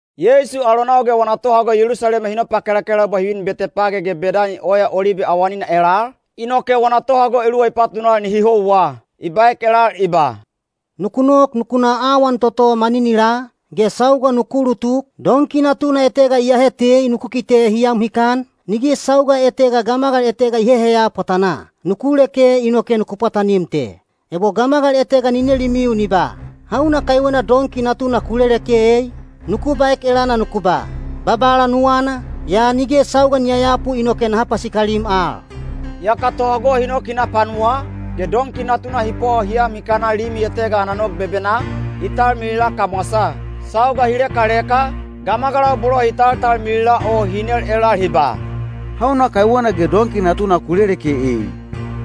Yeisu alonau ge wana tohago Yelusalema hi nopakelakelaubwa hi vin Betepage ge Bedani Oya Olibe awanina elal, inoke wana tohago eluwa i patunal nihi houwa. I baek elal i ba, “Nuku nok nuku na awan toto maninilaa, ge sauga nuku ulutuk, donki natuna etega iyahe tei nuku kite hi am hikan, nige sauga etega gamagal etega i heheya pwatanaa. Nuku leke inoke nuku pwatanim te. Ebo gamagal etega ni nelimiu ni ba, ‘Hauna kaiwena donki natuna ku leleke ei?’ nuku baek elana nuku ba, ‘Babala nuwana, yaa nige sauga ni yayapu inoke naha pasikalim al.’” Yaka tohago hi nok hi na panuwaa, ge donki natuna hi pwawa hi am hikana limi etega ana nog bebenaa, i talmilila kamwasaa. Sauga hi lekaleka, gamagalau bolo hi taltalmilila o hi nel elal hi ba, “Hauna kaiwena ge donki natuna ku leleke ei?”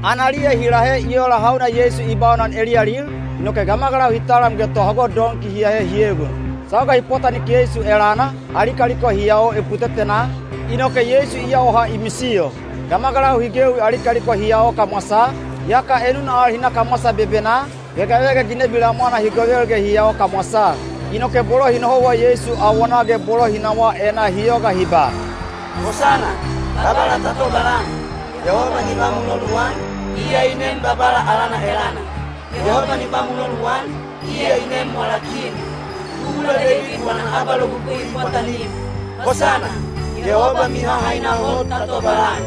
Analiya hi lahe i ola hauna Yeisu i baunan eliyalil, inoke gamagalau hi talam ge tohago donki hi ahe hi egon. Sauga hi pwatanik Yeisu elana, ali kaliko hi yao eputetenaa, inoke Yeisu i yawaha i misiyo. Gamagalau hi gewi ali kaliko hi yao kamwasaa, yaka enuna al hi na kamwasa bebenaa, vegavega ginebi lamwana hi govel ge hi yao kamwasaa. Inoke bolo hi nohouwa Yeisu awonaa ge bolo hi nawaa enaa hi yoga hi ba, “Hosana! Babala ta tobalan!” “Yehoba ni ba muloluan, iya i nem Babala alana elana!” “Yehoba ni ba muloluan, iya i nem wala Kin, tubula Deibid wana abalogugui i pwatanim!” “Hosana! Yehoba mihahaina hot ta tobalan!”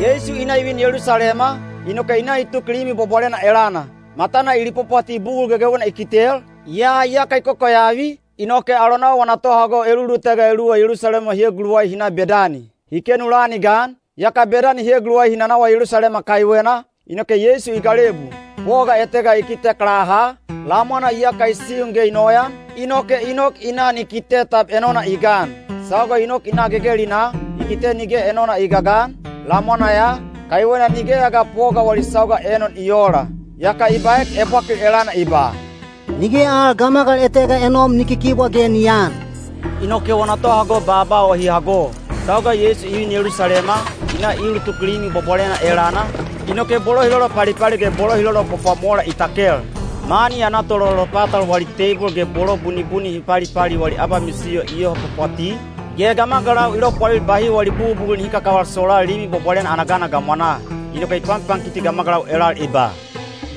Yeisu i na i vin Yelusalema, inoke i na i tuk Limi Bwabwalena elana. Matana i lipwapwati bugul gegewena i kitel, yaa iyaka i kokoyavi, inoke alonau wana tohago elulutega eluwa Yelusalema hi eguluwai hi na Bedani. Hi kenu lan i gan, yaka Bedani hi eguluwai hi nanawa Yelusalema kaiwena, inoke Yeisu i galebu. Poga etega i kitek laha, lamwana iyaka i siun ge i noyan, inoke i nok i na ni kite tab enona i gan. Sauga i nok i na gegelinaa, i kite nige enona i gagan, lamwana ya, kaiwena nigeya ga poga wali sauga enon i oola. Yaka i baek ebwakil elana i ba, “Nige al gamagal etega enom ni kikibwa ge ni aan.” Inoke wana tohago baaba o hi hago. Sauga Yeisu i vin Yelusalema, i na i ulutuk Limi Bwabwalena elana, inoke bolo hi lolopalipali ge bolo hi lolopwapwamola i takel. Mani ana tololopatal wali teibol ge bolo bunibuni hi palipali wali abamisiyo i yoho pwapwati, ge gamagalau i lopwalil bahi wali bugubugul nihi kakaval solaa Limi Bwabwalena ana gana gamwanaa. Inoke i panpankiti gamagalau elal i ba,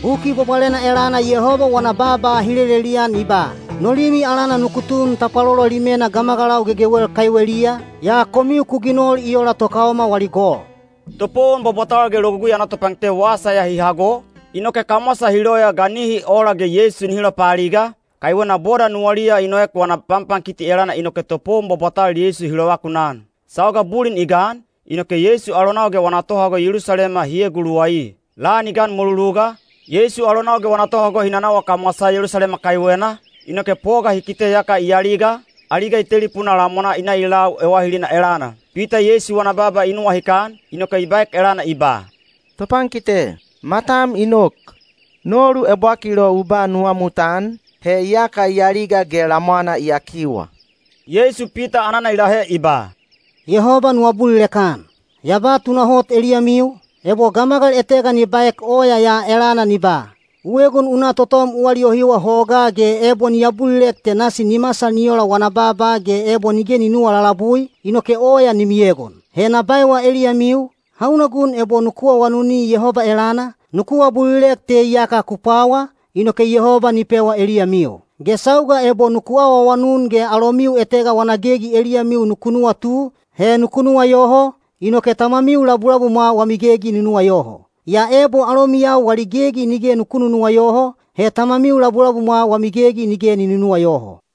“Buki Bwabwalena elana Yehoba wana baaba hi lelelian i ba, ‘No limi alana nuku tun tapwalolo limena gamagalau gegewel kaiweliya,’ yaa komiu ku ginol i ola tokaoma wali gol.” Topowon bwabwatal ge Logugui ana topankite wasa ya hi hago, inoke kamwasa hi loya ga nihi ola ge Yeisu nihi lopaaliga, kaiwena boda nuwaliya i noek wana panpankiti elana inoke topowon bwabwatal Yeisu hi lovakunan. Sauga bulin i gan, inoke Yeisu alonau ge wana tohago Yelusalema hi eguluwai. Lan i gan mweluluga, Yeisu alonau ge wana tohago hi nanawa kamwasaa Yelusalema kaiwena, inoke poga hi kite iyaka i aliga, aliga i telipunaa lamwanaa i na i lau ewahilina elana. Pita Yeisu wana baaba i nuwahikan, inoke i baek elana i ba, “Topankite, matam i nok! Nolu ebwakil o u ba nuwamutan, he iyaka i aliga ge lamwana i yakiwa.” Yeisu Pita anana i lahe i ba, “Yehoba nu abulilek-an. Ya ba tunahot eliyamiu, ebo gamagal etega ni baek oya ya elana ni ba, ‘U egon u na totom u aliyohiwa hogaa’ ge ebo ni abulilek te nasi ni masal ni ola wana baaba ge ebo nige ni nunuwa lalabui, inoke oya ni miegon. He na baewa eliyamiu, hauna gun ebo nuku awanuni Yehoba elana, nuku abulilek te iyaka ku pwawa, inoke Yehoba ni pewa eliyamiu. Ge sauga ebo nuku awaawanun ge alomiu etega wana gegi eliyamiu nuku nuwatu, he nuku nuwayoho, inoke Tamamiu labulabumwa wami gegi ni nuwayoho. Yaa ebo alomiyau wali gegi nige nuku nunuwayoho, he Tamamiu labulabumwa wami gegi nige ni nunuwayoho.”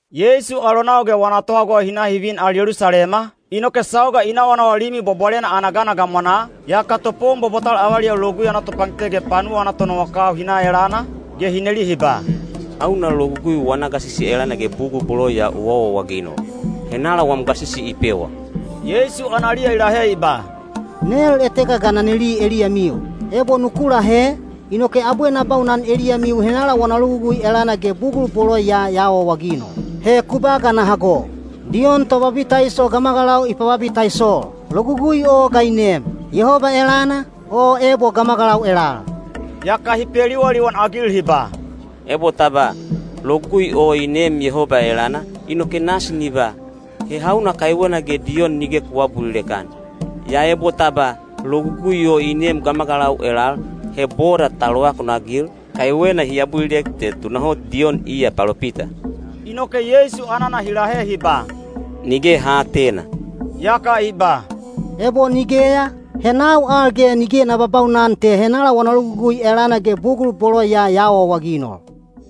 Yeisu alonau ge wana tohago hi na hi vin al Yelusalema, inoke sauga i nawanawa Limi Bwabwalena ana gana gamwanaa, yaka topowon bwabwatal avaliyau Logugui ana topankite ge panuwa ana tonowakau hi na elana, ge hi neli hi ba, “Hauna logugui wana gasisi elana ge bugul bolo ya u awaawaginol? Henala wam gasisi i pewa?” Yeisu analiya i lahe i ba, “Nel etega ga na neli eliyamiu. Ebo nuku lahe, inoke abwe na baunan eliyamiu henala wana logugui elana ge bugul bolo ya ya awaawaginol. He ku ba ga na hago! Diyon Tobabitaiso gamagalau i pababitaisol. Logugui o ga i neem? Yehoba elana, o ebo gamagalau elal?” Yaka hi peliwaliwan-agil hi ba, “Ebo ta ba, ‘Logugui o i neem Yehoba elana,’ inoke nasi ni ba, ‘He hauna kaiwena ge Diyon nige ku aabulilek-an?’ Yaa ebo ta ba, ‘Logugui o i neem gamagalau elal’, he boda ta lovakunagil, kaiwena hi abulilek te tunahot Diyon iya palopita.” Inoke Yeisu anana hi lahe hi ba, “Nige ha aatena.” Yaka i ba, “Ebo nigeya, he nau al ge nige na babaunan te henala wana logugui elana ge bugul bolo ya ya awaawaginol.”